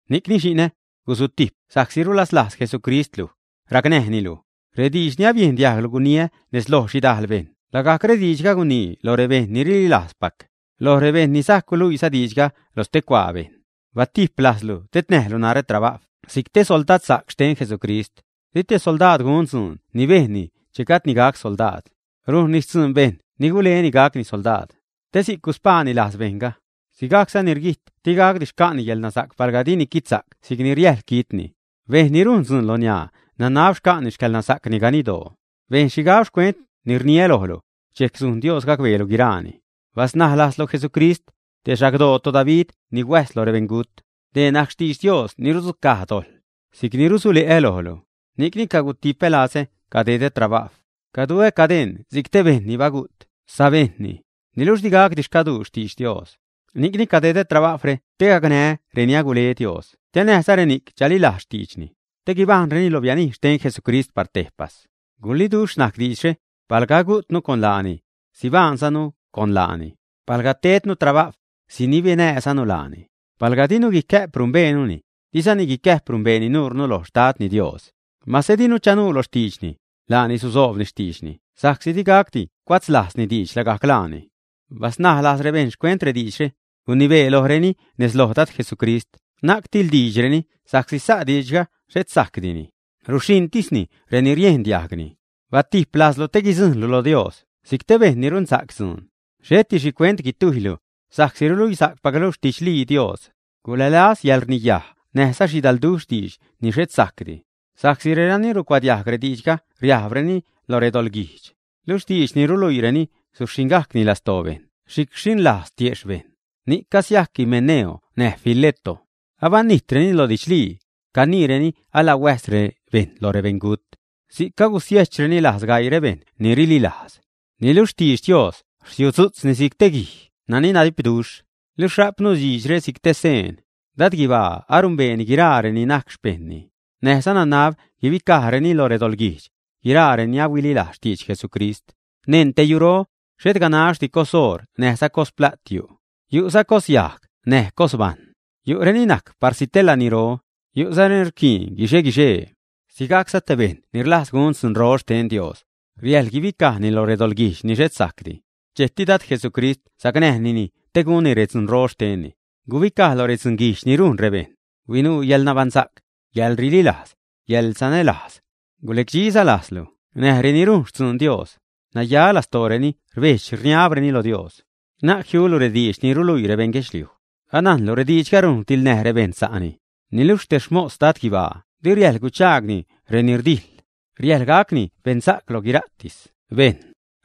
Ni'cni xi'nä, guzutijp sa'csi rulaslajz Jesucrist luj, racnäjnilu. Rediidx ni abiejn diajglu guniä nez loj xhidal bejṉ lagajc rediidxga guniini lo rebejṉ ni rililajzpac, loj rebejṉ ni sajc guluiiza diidxga lo stecuaa bejṉ. Batijp lajzlu tednäjlu narä trabajw si'c te soldadsa'c xten Jesucrist. Di te soldaad gun dzuun ni bejnni che gajdni gac soldaad. Rujnni xtzuun bejṉ ni guleni gacni soldaad, te si'c guspaani lajz bejṉga. Sigajcza, ni rguijt digacdi xca'ni yäḻnasa'c palga dini quitsa'c si'c riäjḻ quitni. Bejṉ ni rujn dzuun loniaa nanab xca'ni xcäḻnasa'cni ganidoo. Bejn xhigab xcuent ni rniä lojlu, dxejc sujn Dios gacbeelu guiraani. Basnaj lajzlu Jesucrist, te xagdoo toDavid ni huäjz lo rebeṉgut. Dee najc xtidx Dios ni rudzucaj dojḻ, si'c ni rusule'ä lojlu. Ni'cni cagutipä lazä cadedä trabajw, caduä cadeṉ si'c te bejṉ ni bagu't sabejṉni. Niluxh digacdi xcaduu xtidx Dios. Ni'cni cadedä trabajwre te gacnää́ reni agule Dios te näjza reni'c chalilajz xtiidxni te guibajṉreni lo bianij xten Jesucrist par tejpas. Guliiduxh najc diidxre; palga agujtnu con laani, sibaṉnäjzanu laani. Palga rdejdnu trabajw, sinibenäjzanu laani. Palga dinu guicä'p numbeenuni, dizani guicäjp numbeeni nuurnu loj Xtadni Dios. Mase dinu chanuu lo xtiidxni, laani susoobni xtiidxni sa'csi digacdi cuatzlajzni diidx lagajc laani. Basnaj lajz rebejṉ xcuent rediidxre, gunibee lojreni nez lo Dad Jesucrist na'c tiḻdiidxreni sa'csi sa' diidxga xhet sajcdini, ruxhiṉtisni reni riendiajgni. Batijp lajzlu te guidzujṉlu lo Dios si'c te bejṉ ni runsa'c dzuun, xheti xhicuent guitujylu, sa'csi ruluisa'cpaclu xtidxliitis Dios. Gulälaz yäḻrniyaj näjza xhidalduxh diidx ni xhet sajcdi, sa'csi renani rucuadiajg rediidxga riajbrureni lo redoḻguijdx. Luxh diidx ni ruluiireni suxhiṉgajcni lastoo bejṉ si'c rxhiṉlajz tiejxh bejṉ. Ni'c casiajc Himeneo näj Fileto. Abanijtreni lo didxlii. Caniireni ala huäjs bejṉ lo rebeṉgut. Si'c cagusiejchreni lajz gaii rebejṉ ni rlilajz. Niluxh xtidx Dios rsiudzu'tzni si'c te guij nani nadipduxh, luxh rajpnu diidxre si'c te seen: “Dad guibaa anumbee guiraa reni najc xpejṉni”; näjza “Nanab guibicajreni lo redoḻguijdx, guiraa reni ahuililajz xtidx Jesucrist.” Neṉ te yuro, xhet ganaxdi cos oṟ näjza cos plat yu'. Yu'za cos yajg näj cos bajṉ; yu'reni najc parsi te laniro, yu'za reni rquiin guixe-guixee. Sigajcza te bejṉ ni rlajz gun dzuunro xten Dios, riäjḻ guibicajni loj redoḻguijdx ni xhet sajcdi. Dxejcti Dad Jesucrist sacnäjni te gunni redzunro xtenni. Gubicaj lo redzunguijdx ni rujn rebejṉ, huinuu yäḻnabaṉsa'c, yäḻrililajz, yäḻsanälajz, gulecdxiza lajzlu näj reni rujn xtzuun Dios, naya lastooreni rbedx-rniabreni lo Dios. Na'c jiulu rediidx ni ruluii rebejṉ guedxliuj. Anajnlu rediidxga rujn rdiḻnäj rebejṉ sa'ni. Niluxh te xmos Dad guibaa di riäjḻ guchaagni reni rdijḻ; riäjḻ gacni beṉsa'c loj guiraatis bejṉ.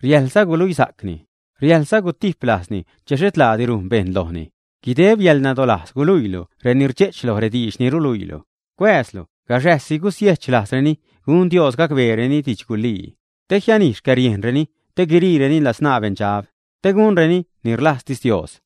Riäjḻza guluisa'cni; riäjḻza gutip lajzni che xhet laadi rujn bejṉ lojni. Guideb yäḻnadolajz guluiilu reni rdxe'ch loj rediidx ni ruluiilu. Cuääzlu gaxäjsi gusiejch lajzreni gun Dios gacbeereni didxgulii, te jianij xcäriejnreni te guiriireni ladzṉaa beṉdxab, te gunreni ni rlajztis Dios.